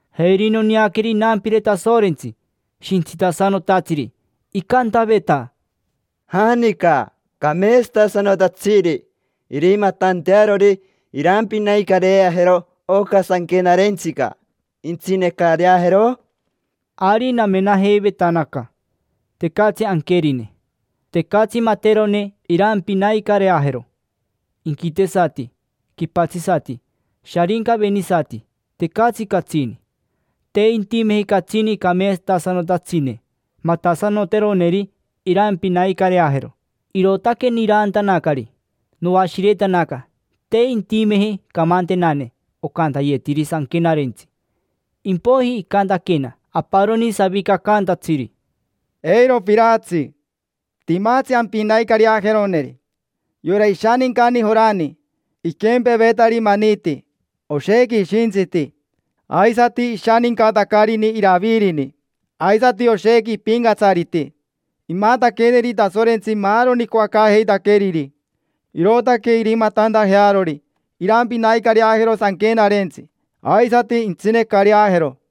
Jeri noneaqueri inampire Tasorentsi, shintsitasanotatsiri, icantaveta: —¿Janica cameetsatasanotatsiri irimatantearori irampinaicareajero oca sanquenarentsica, intsinecareajero? Ari namenajeivetanaca, tecatsi anquerine. Tecatsi materone irampinaicareajero: inquitesati, quipatsisati, sharincavenisati, tecatsi catsini. Te intimeji catsini cameetsatasanotatsine, matasanoteroneri irampinaicareajero, irootaque niraantanacari: noashiretanaca te intimeji camantenane ocantayetiri sanquenarentsi. Impoiji icantaquena aparoni savicacaantatsiri: —Eiro piraatsi. Timatsi ampinaicareajeroneri: yora ishanincani Jorani; iquempevetari maniti, oshequi ishintsiti. Aisati ishanincatacarini Iravirini, aisati oshequi ipincatsariti. Imataqueneri Tasorentsi maaroni icoacaajeitaqueriri, irootaque irimatantajearori irampinaicareajero sanquenarentsi, aisati intsinecareajero.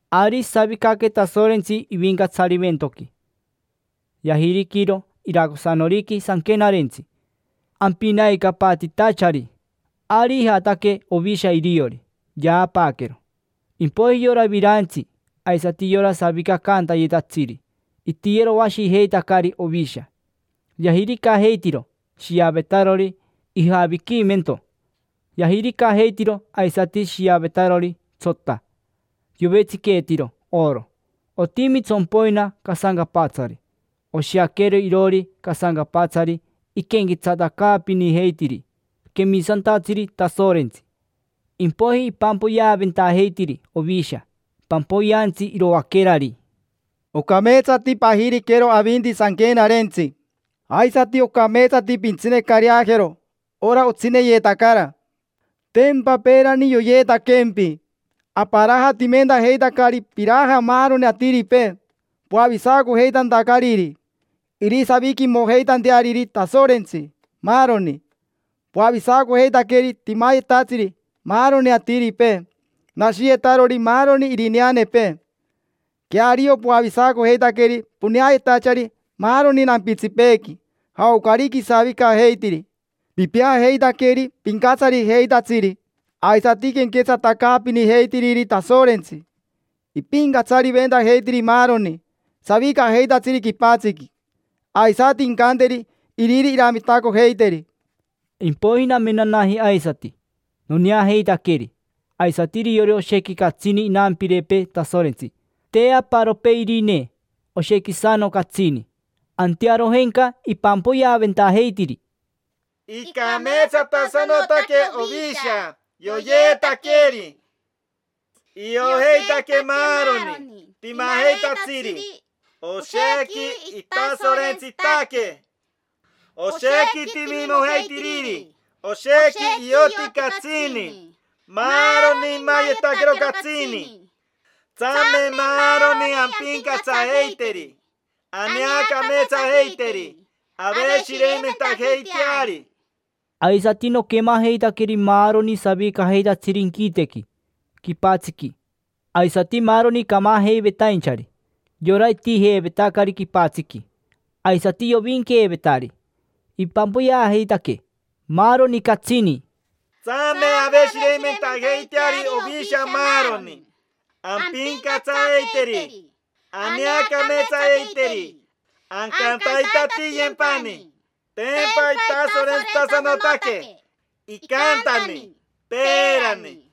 Ari isavicaque Tasorentsi ivincatsarimentoqui, yajiriquiro iracosanoriqui sanquenarentsi, ampinaicapatitachari. Ari ijataque Ovisha iriori, yaapaaquero. Impoiji yora virantsi aisati yora savicacantayetatsiri itiyeroashijeitacari Ovisha. Yajiricajeitiro shiavetarori ijaviquimento; yajiricajeitiro aisati shiavetarori tsota, yovetsiqueetiro oro: otimi tsompoina casancapatsari. Oshiaquero iroori casancapatsari iquenquetsatacaapinijeitiri quemisantatsiri Tasorentsi. Impoiji ipampoyeaventajeitiri Ovisha pampoyeantsi iroaquerari: Ocameetsati pajiriquero avinti sanquenarentsi, aisati ocameetsati pintsinecareajero ora otsineyetacara. Tempa peerani yoyeetaquempi, aparajatimentajeitacari piraja maaroni atiripee, poavisacojeitantacariri irisaviquimojeitanteariri Tasorentsi, maaroni. Poavisacojeitaqueri timayetatsiri maaroni atiripee, nashiyetarori maaroni irineanepee. Queario, poavisacojeitaqueri poneayetachari maaroni nampitsipeequi, jaocarica isavicajeitiri. Pipeajeitaqueri pincatsarijeitatsiri aisati quenquetsatacaapinijeitiriri Tasorentsi: impincatsariventajeiteri maaroni savicajeitatsiri quipatsiqui, aisati incanteri Iriri iramitacojeiteri. Impoiji namenanaji aisati, noneajeitaqueri; aisati iriori oshequi catsini inampirepee Tasorentsi: te aparopee irine, oshequisano catsini. Antearojenca ipampoyeaventajeitiri: Icameetsatasanotaque Ovisha yoyeetaqueri, iojeitaque maaroni timajeitatsiri oshequi itasorentsitaque, oshequi timimojeitiriri, oshequi ioti catsini, maaroni imayetaquero catsini. Tsame maaroni ampincatsajeiteri, aneacameetsajeiteri, aveshireimentajeiteari. Aisati noquemajeitaqueri maaroni savicajeitatsiri inquitequi, quipatsiqui, aisati maaroni camajeivetainchari: yora itijeevetacari quipatsiqui, aisati yovinqueevetari; ipampoyeajeitaque maaroni catsini: Tsame aveshireimentajeiteari Ovisha maaroni, ampincatsajeiteri, aneacameetsajeiteri, ancantaitatiyempani. Tempa itasorentsitasanotaque, icantani, peerani.